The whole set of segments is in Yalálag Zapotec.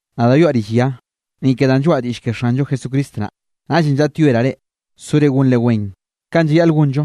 Nadaꞌ yoaꞌ rill ya, ni ke danꞌ lloaꞌa diꞌll ke Xanllo Jesucristo naꞌ. Naꞌllenꞌ llaꞌtyoeraꞌ reꞌ sore gonre wen, kanꞌ llayaꞌl gonllo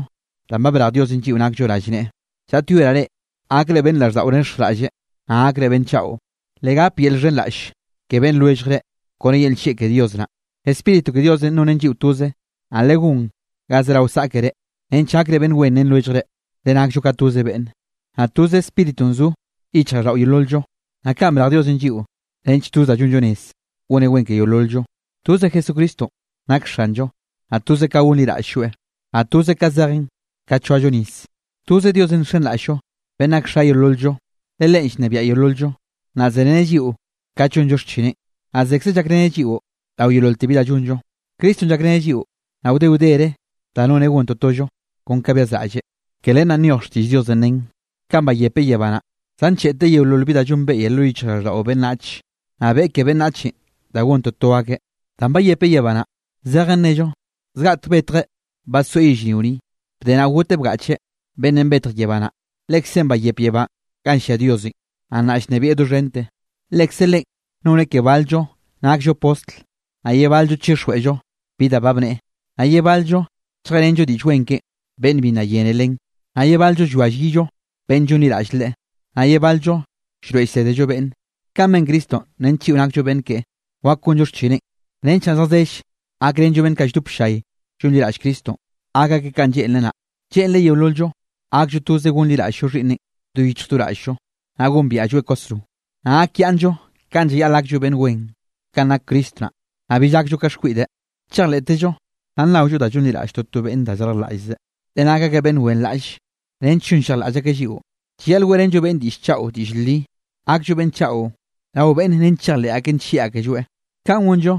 danꞌ brej Diosenꞌ lliꞌo nakllo rallneꞌe. Llaꞌtyoeraꞌ reꞌ gakre beꞌnn raꞌlldaꞌo nexjraꞌlle, naꞌ gakre beꞌnn chaꞌo. Legap yel llxhenraꞌll ke beꞌnn lwelljre kone yel nllieꞌ ke Dios naꞌ. Spíritu ke Diosenꞌ nonen lliꞌo toze, naꞌ legón ga zerao saꞌkere nench gakre beꞌnn wen ren lwelljre. Le nakllo ka toze beꞌnne, naꞌ toze Spíritunꞌ zo yichjraꞌlldaꞌo yeolol-llo. Naꞌ kaꞌn brej Diosenꞌ lliꞌo nench toz da llonllo rez, goneꞌ wen ke yeolol-llo. Toze Jesucristonꞌ nak Xanllo, naꞌ toze ka gonliraꞌll-lloeꞌ, naꞌ toze ka zejen ka choallo nis. Toze Diosenꞌ nxenraꞌll-llo beꞌnn nak Xa yeolol-llo. Le Leꞌen llnebiaꞌ yeolol-llo, naꞌ zereneꞌ lliꞌo kat llonllo xchineꞌn, naꞌ zekzeꞌ llakreneꞌ lliꞌo rao yeololte bi da llonllo. Cristonꞌ llakreneꞌ lliꞌo, naꞌ wde wdere da noneꞌ gon totollo kon ka byazraꞌlleꞌ. Ke len naꞌ nyoj xtiꞌll Diosenꞌ nen: Kanꞌ bayepeꞌ yebá naꞌ, zancheꞌteꞌ yeololte bi da llonbeꞌye lo yichjraꞌlldaꞌo beꞌnnach. Naꞌ beꞌe ke ke beꞌnnachenꞌ da gon toto akeꞌ. Danꞌ bayepeꞌ yebá naꞌ, zejen nnello zgaꞌtek betjeꞌ badsoeꞌ yellrio ni, bde naꞌ goteꞌ bgaꞌcheꞌ. Beꞌnnenꞌ betj yebá naꞌ, Lekzeꞌn bayep yebá ganꞌ llia Diosenꞌ, naꞌ nnaꞌ llnebieꞌ doxhente. Lekze Leꞌen noneꞌ ke bal-llo nakllo postl, naꞌ ye bal-llo chixjweꞌllo bi da ba bneꞌe, naꞌ ye bal-llo lljeꞌrenllo Diꞌll Wen keꞌen beꞌnn bi nna yene len, naꞌ ye bal-llo llwia llyillo beꞌnn llonliraꞌll Leꞌe, naꞌ ye bal-llo llroeꞌ llsédello beꞌnne. Kanꞌ ben Cristonꞌ nench lliꞌo nakllo beꞌnn keꞌe wak gonllo xchineꞌn, nench naꞌ zjazell gakrenllo beꞌnn kaꞌ lldop ll-llay llonliraꞌll Cristonꞌ, gak akeꞌ kanꞌ lleꞌnreꞌ naꞌ. Lleꞌnreꞌ yeolol-llo gakllo toze gonliraꞌll-llo Xhiꞌnneꞌn do yichj do raꞌll-llo, naꞌ gombiaꞌlloeꞌ kwasro. Naꞌ gakyaꞌnnllo kanꞌ llayaꞌl gakllo beꞌnn wen, kanꞌ nak Cristo naꞌ. Naꞌ bill gakllo ka xkwiꞌde, chejleꞌtezllo naꞌ nnaollo da llonliraꞌll toto beꞌnn da llarjlaꞌllzeꞌ, le nak akeꞌ beꞌnn wenraꞌlle nench llonllejlaꞌll akeꞌ lliꞌo. Llayaꞌl weꞌrenllo beꞌnne diꞌll chaꞌo diꞌll li, gakllo beꞌnn chaꞌo rao beꞌnne nench chejleꞌ akeꞌ nllieꞌ akelloeꞌ. Kaꞌn gonllo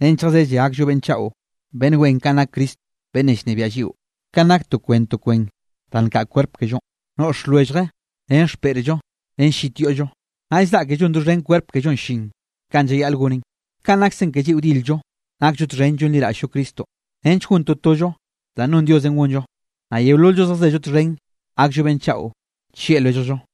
nench zjazelle gakllo beꞌnn chaꞌo beꞌnn wen kanꞌ nak Cristo beꞌnnenꞌ llnebiaꞌ lliꞌo. Kanꞌ nak to kwen to kwen da nkaꞌ kwerp kellonꞌ, noꞌx lwellje ren xpeꞌrllo ren llit yoꞌllo, naꞌll zaꞌke llon doxhen kwerp kellonꞌ llin kanꞌ llayaꞌl gonen. Kaꞌn nakse ke lliꞌo dil-llo nakllo txhen llonliraꞌll-llo Cristonꞌ nench gon totollo danꞌ non Diosenꞌ gonllo, naꞌ yeolol-llo zjazello txhen gakllo beꞌnn chaꞌo llieꞌ lwelljllo.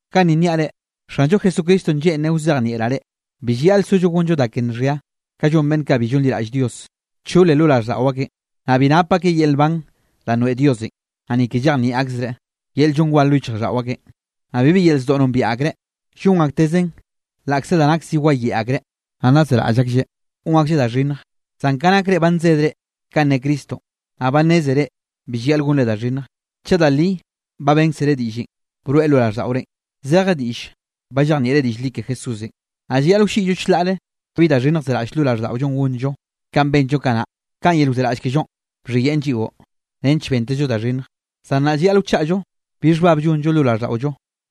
Ganni nniaꞌ reꞌ, Xanllo Jesucristonꞌ lleꞌnreꞌ wzejnieꞌraꞌ reꞌ: bi llayaꞌl sollo gonllo da ke nxhia kanꞌ llon beꞌnn kaꞌ bi llonliraꞌll Dios. Nchole lo raꞌlldaꞌo akeꞌn. Naꞌ bi nap akeꞌ yel nban danꞌ noeꞌ Diosenꞌ, naꞌ ni ke llejnieꞌ akzereꞌ, yel llon war lo yichjraꞌlldaꞌo akeꞌn. Naꞌ bibi yel zdoꞌ nombiaꞌ akreꞌ, llon aktezeꞌn laꞌkze da nak zi wayeꞌe akreꞌ, naꞌ nna zeraꞌll aklleꞌ gon aklleꞌ da xhinnj. Zan ka nak reꞌ ba nsedre kanꞌ ne Cristonꞌ, naꞌ ba nnézere bi llayaꞌl gonre da xhinnjenꞌ, chaꞌ da li ba bénkzere diꞌllenꞌ broeꞌ lo raꞌlldaꞌorenꞌ, zeje diꞌlle ba llejnieꞌre diꞌll li ke Jesúsenꞌ. Naꞌ llayaꞌl wlliꞌyllo chlaꞌre bi da xhinnj zeraꞌll lo raꞌlldaꞌollo gonllo, kanꞌ benllo kanaꞌ kanꞌ yel wzeraꞌll kellonꞌ bxhiyeꞌn lliꞌo, nench bentezllo da xhinnj. Zan nnaꞌ llayaꞌl wachaꞌllo bi xhbab llonllo lo raꞌlldaꞌollo.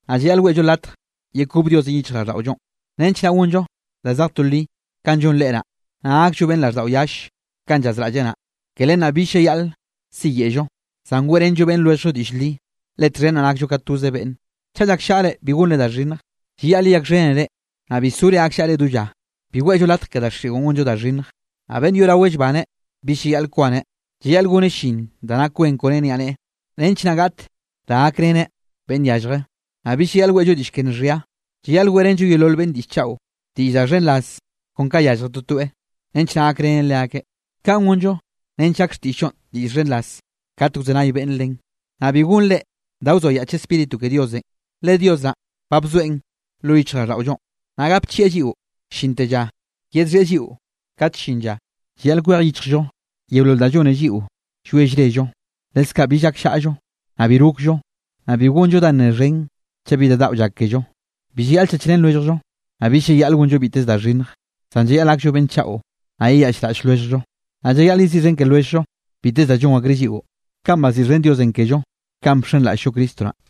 Naꞌ llayaꞌl weꞌllo latj yekob Diosenꞌ yichjraꞌlldaꞌollonꞌ, nench naꞌ gonllo da zej to li, kanꞌ llon Leꞌe naꞌ, naꞌ gakllo beꞌnn raꞌlldaꞌo yalle kanꞌ llazraꞌlleꞌ naꞌ. Ke len naꞌ bill llayaꞌl siyeꞌllo, zan weꞌrenllo beꞌnn lwelljllo diꞌll li, le txhen naꞌ nakllo ka toze beꞌnne. Chaꞌ llakllaꞌre, bi gonre da xhinnj. Llayaꞌl yeyakxhénere naꞌ bi sore gakllaꞌre do lla. Bi weꞌllo latj ke daxiꞌon gonllo da xhinnj. Naꞌ beꞌnn yoꞌraweꞌ llbaneꞌ bill llayaꞌl kwaneꞌ. Llayaꞌl goneꞌ llin da nak wen kone niaꞌneꞌe, nench naꞌ gaꞌt da gakreneꞌ beꞌnn yallje. Naꞌ bi llayaꞌl weꞌllo diꞌll ke nxhia, llayaꞌl weꞌrenllo yeolol beꞌnn diꞌll chaꞌo, diꞌll da xhenraz kon ka yallje totoeꞌ, nench naꞌ gakrenen leakeꞌ. Kaꞌn gonllo nench gak xtiꞌll-llonꞌ diꞌll xhenraz kat wzenay beꞌnn len. Naꞌ bi gonre da wzoayaꞌch Spíritu ke Diosenꞌ, le Dios naꞌn ba bzoeꞌn lo yichjraꞌlldaꞌollonꞌ, naꞌ gapchieꞌ lliꞌo llinte llanꞌ yedxhieꞌ lliꞌo kat llin lla. Llayaꞌl kwej yichjllo yeolol danꞌ llone lliꞌo llwie llrello, leskaꞌ bill gakllaꞌllo, naꞌ bi rokllo, naꞌ bi gonllo da nne xhen chaꞌ bi da daꞌo llak kello. Bi llayaꞌl chachrén lwelljllo, naꞌ bill llayaꞌl gonllo biteze da xhinnj. Zan llayaꞌl gakllo beꞌnn chaꞌo, naꞌ yeyaꞌchraꞌll lwelljllo. Naꞌ llayaꞌl yeziꞌxhen ke lwelljllo biteze da llon akreꞌ lliꞌo, kanꞌ baziꞌxhen Diosenꞌ kello kanꞌ bxenraꞌll-llo Cristo naꞌ.